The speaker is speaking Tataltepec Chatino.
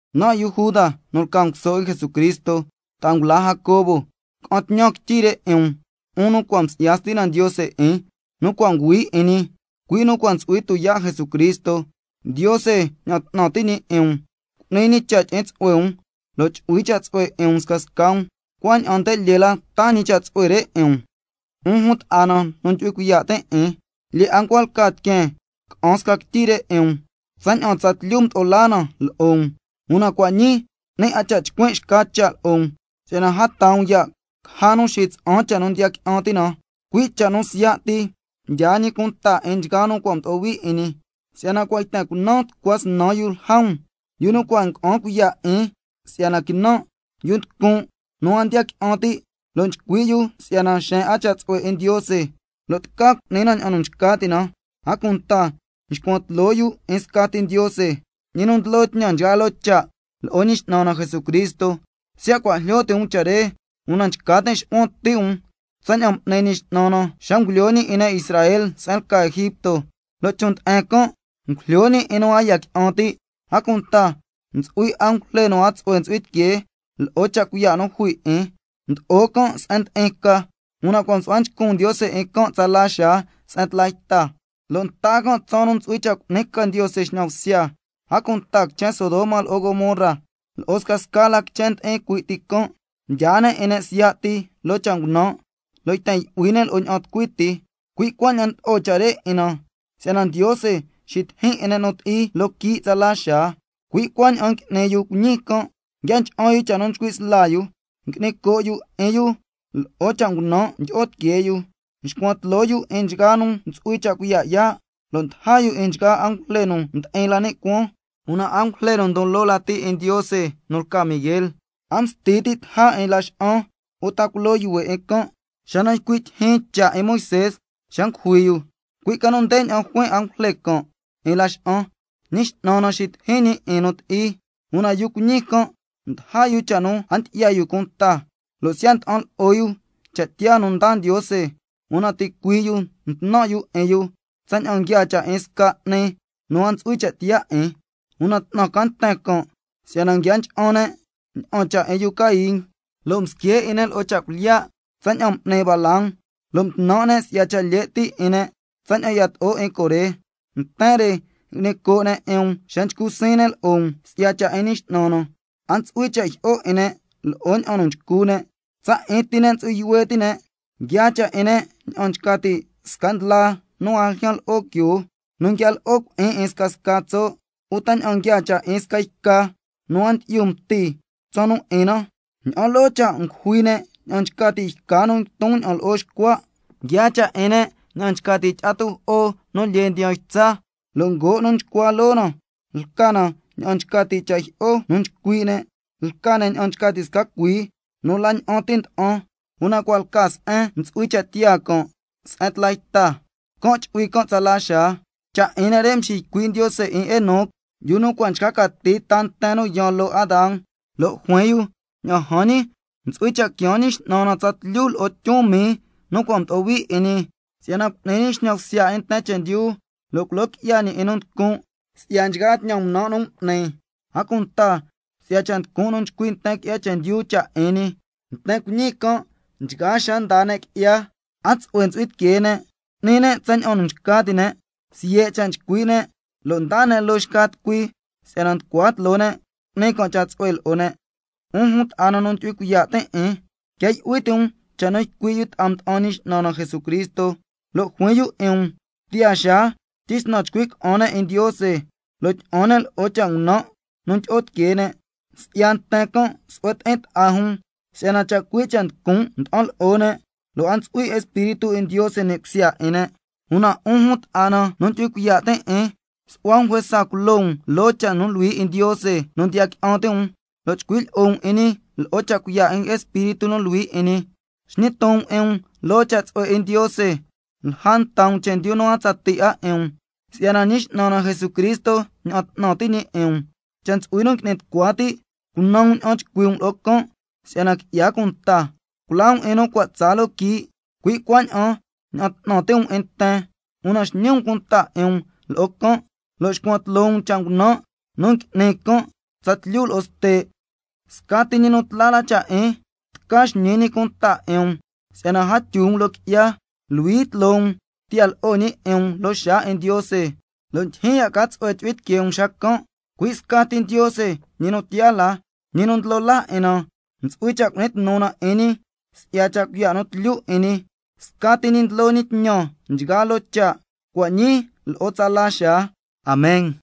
Nan' yu Juda nu lca nguso 'in Jesucristo, ta'a ngula Jacobo, ca'an tñan quityi re 'in um, 'un nu cua' msi'ya Stina Ndiose 'in, nu cua' nguhui 'in ñi, cui' nu cua' ntsu'hui tuyaa' Jesucristo. Ndiose ña'an 'tnan ti' ñi 'in um, cu'ni ñi cha' tyi'in tsu'hue um, lo' chu'hui cha' tsu'hue 'in um scasca um, cuaña'an nde lyee la taa ñi cha' tsu'hue re 'in um. 'Un jun ta'a na nu ndyu'hui cuiya' tin' 'in, lyee 'a ncua lca tiqueen ca'an sca quityi 'in um, tsaña'an tsatlyu mdo'o laa na lo'o um, una cua' ñii 'ni 'a cha' chcuin' xca cha' lo'o um, si'yana a taa um ya' caja nu xitsa'an cha' nu ndiya qui'an ti' na, cui' cha' nu siya' ti mdyaa ñi cunta 'in nchgaa nu cua' mdo'o hui 'in ñi. Si'yana cua' yten cunan tucua snan yu lja um, yu nu cua' ngua'an cuiya' 'in si'yana quinan', yu nducun' nu a ndiya qui'an ti', lo' nchcui' yu si'yana xeen 'a cha' tsu'hue 'in Ndiose lo' tca cu'ni na ña'an nu nchca ti' na, a cunta nxcuan tloo yu 'in scati Ndiose, ñi nu ndlo tñan nchgaa loo cha', lo'o 'in Ñi X'nan na Jesucristo. Siya' cua' jlyo ti' um cha' re, una nchca tin' xu'huan ti' um tsaña'an m'ni Ñi X'nan na xa ngulyo ñi 'in ne' Israel se'en lca Egipto, lo' chon' nde'en can' ngujlyo ñi 'in nu a ndiya qui'an ti'. A cunta ntsu'hui angujle nu a tsu'hue ntsu'hui tiquee lo'o cha' cuiya' nu jui 'in, mdo'o can' se'en ndi'in ca, una cua' msu'hua nchcun Ndiose 'in can' tsala xaa se'en tla yta, lo' nta can' tsaan nu ntsu'hui cha' cu'ni ca Ndiose xñan bsya. A cunta quichen Sodoma lo'o Gomorra lo'o scasca la quichen ndi'in cui' ti can', mdyaa ne' 'in ne' siya' ti loo cha' ngunan' lo' yten yu'hui ne' lo'o ña'an tucui ti, cui' cuaña'an ndlo'o cha' re 'in na si'yana Ndiose xitijin 'in ne' nu ti'i loo quii' tsala xaa. Cui' cuaña'an ngui'ni yu cuiñi can', nguia ncha'an yu cha' nu nchcui' sla yu, ngui'ni coo' yu 'in yu lo'o cha' ngunan' ndyi'o tiquee yu, nxcuan tloo yu 'in nchgaa nu ntsu'hui cha' cuiya' yaa', lo' ndaja yu 'in nchgaa angujle nu ndi'in la ni' cuaan. Una angujle nu ndon loo lati 'in Ndiose nu lca Miguel, a msti ti' taja 'in laxa'an uta culo yuhue' 'in can' xa nu ycui' tyijyin cha' 'in Moisé xa ngujui yu, cui' ca nu ndeña'an juin angujle can' 'in laxa'an: Ñi X'nan na xitijin ñi 'in nu ti'i. Una yu cuiñi can' ndaja yu cha' nu a ndyi'ya yu cunta, lo' siya' nda'an lo'o yu cha' tiyaa nu ndaa Ndiose, una ticuii' yu ntnan' yu 'in yu tsaña'an nguiaa cha' 'in sca 'ni nu a ntsu'hui cha' tiyaa 'in. Una 'tnan ca nten can', si'yana nguia ncha'an ne' ña'an cha' 'in yu Caín, lo' msque' 'in ne' lo'o cha' cuilyiya' tsaña'an m'ni Balaam, lo' mtnan' ne' si'ya cha' lye' ti' 'in ne' tsaña'an yato'o 'in Coré. Nten re ngui'ni coo' ne' 'in um xa ndiyo' ti'in um lo'o ne', lo' nchcu siin um si'ya cha' 'in Ñi X'nan na, a ntsu'hui cha' jyi'o 'in ne' lo'o ña'an nu nchcu ne', tsa 'in ti ne' ntsu'hui yuhue' ti' ne', nguiaa cha' 'in ne' ña'an nchca ti' sca ndlaa nu a ljyan lo'o quioo nu nguia lo'o cui'in 'in scasca tso', uta ña'an nguiaa cha' 'in sca yca nu a ndyi'yu mti tsaan nu 'in na, ña'an loo cha' ngujui ne' ña'an nchca ti' yca nu nguiton ña'an lo'o xcua'. Nguiaa cha' 'in ne' ña'an nchca ti' tyi'a tujo'o nu lyee ndiyan ytsa, lo' ngoo' nu nxcua loo na lca na ña'an nchca ti' cha' jyi'o nu nchcui' ne', lca ne' ña'an nchca ti' sca cuii nu la ña'an ti nda'an, una cua' lca se'en ntsu'hui cha' tiyaa can' se'en tla yta, can' chu'hui can' tsala xaa. Cha' 'in ne' re mxiycui' Ndiose 'in Enoc, yu nu cua' nchca cati ta nten nu yaan loo Adán, lo' juin yu: Ña'an jan ñi, ntsu'hui cha' quiaan Ñi X'nan na tsatlyu lo'o tyun mii nu cua' mdo'o hui 'in ñi, si'yana cu'ni ñi xñan bsya 'in nten chendyu, lo' culo qui'ya ñi 'in nu nducun' si'ya nchgaa tñan ngunan' nu m'ni, a cunta si'ya scasca cha' nducun' nu ycui' nten qui'ya chendyu cha' 'in ñi. Nten cuiñi can' nchgaa xaa ndaa ne' qui'ya, a tsu'hue ntsu'hui tiquee ne', n'ni ne' tsaña'an nu nchca ti' ne', siye' cha' nchcui' ne' lo' ndaa ne' loo xca tucui, si'yana nducua tloo ne' cu'ni can' tsu'hue lo'o ne'. 'Un jun ta'a na nu ndyu'hui cuiya' tin' 'in, quia yu'hui ti' um cha' nu cua' ycui' yu ta'a mda'an Ñi X'nan na Jesucristo, lo' juin yu 'in um: Tiyaa xaa tyisnan chcui' ca'an ne' 'in Ndiose, lo' tyi'an ne' lo'o cha' ngunan' nu tyi'o tiquee ne'. Si'ya nten can' su'hue ti'in ta'a jun, si'yana chacui' cha' nducun' nda'an lo'o ne', lo' a ntsu'hui Espíritu 'in Ndiose ni' cusya 'in ne'. Una 'un jun ta'a na nu ndyu'hui cuiya' tin' 'in, su'hua um juesa culo um loo cha' nu luhui 'in Ndiose nu ndiya qui'an ti' um, lo' chcui' lyi'o um 'in ñi lo'o cha' cuiya' 'in Espíritu nu Luhui 'in ñi. Xñi ton um 'in um loo cha' tsu'hue 'in Ndiose, lja nta um chendyu nu a tsatii 'a 'in um, si'yana Ñi X'nan na Jesucristo ña'an 'tnan ti' ñi 'in um. Cha' ntsu'hui nu ngui'ni tucua ti', cunan um ña'an chcui' um lo'o can' si'yana qui'ya cunta. Culaa um 'in nu cua' tsaa loo quii', cui' cuaña'an ña'an 'tnan ti' um 'in nten, una xñi um cunta 'in um lo'o can', lo' xcuan tloo um cha' ngunan' nu ngui'ni can' tsatlyu lo'o ste'. Scati ñi nu tla la cha' 'in, tca xñi ñi cunta 'in um si'yana a tyu um loo qui'ya, luhui tloo um tiya lo'o ñi 'in um loo xaa 'in Ndiose, lo' ndyijyin ya' ca tsu'hue chu'hui tiquee um xacan', cui' scati Ndiose nu tiyaa la, Ñi nu Ndlo Laa 'in na, ntsu'hui cha' cu'ni tnu na 'in ñi si'ya cha' cuiya' nu tlyu 'in ñi, scati ñi ndlo ñi tñan nchgaa loo cha', cua' ñii lo' tsala xaa. Amen.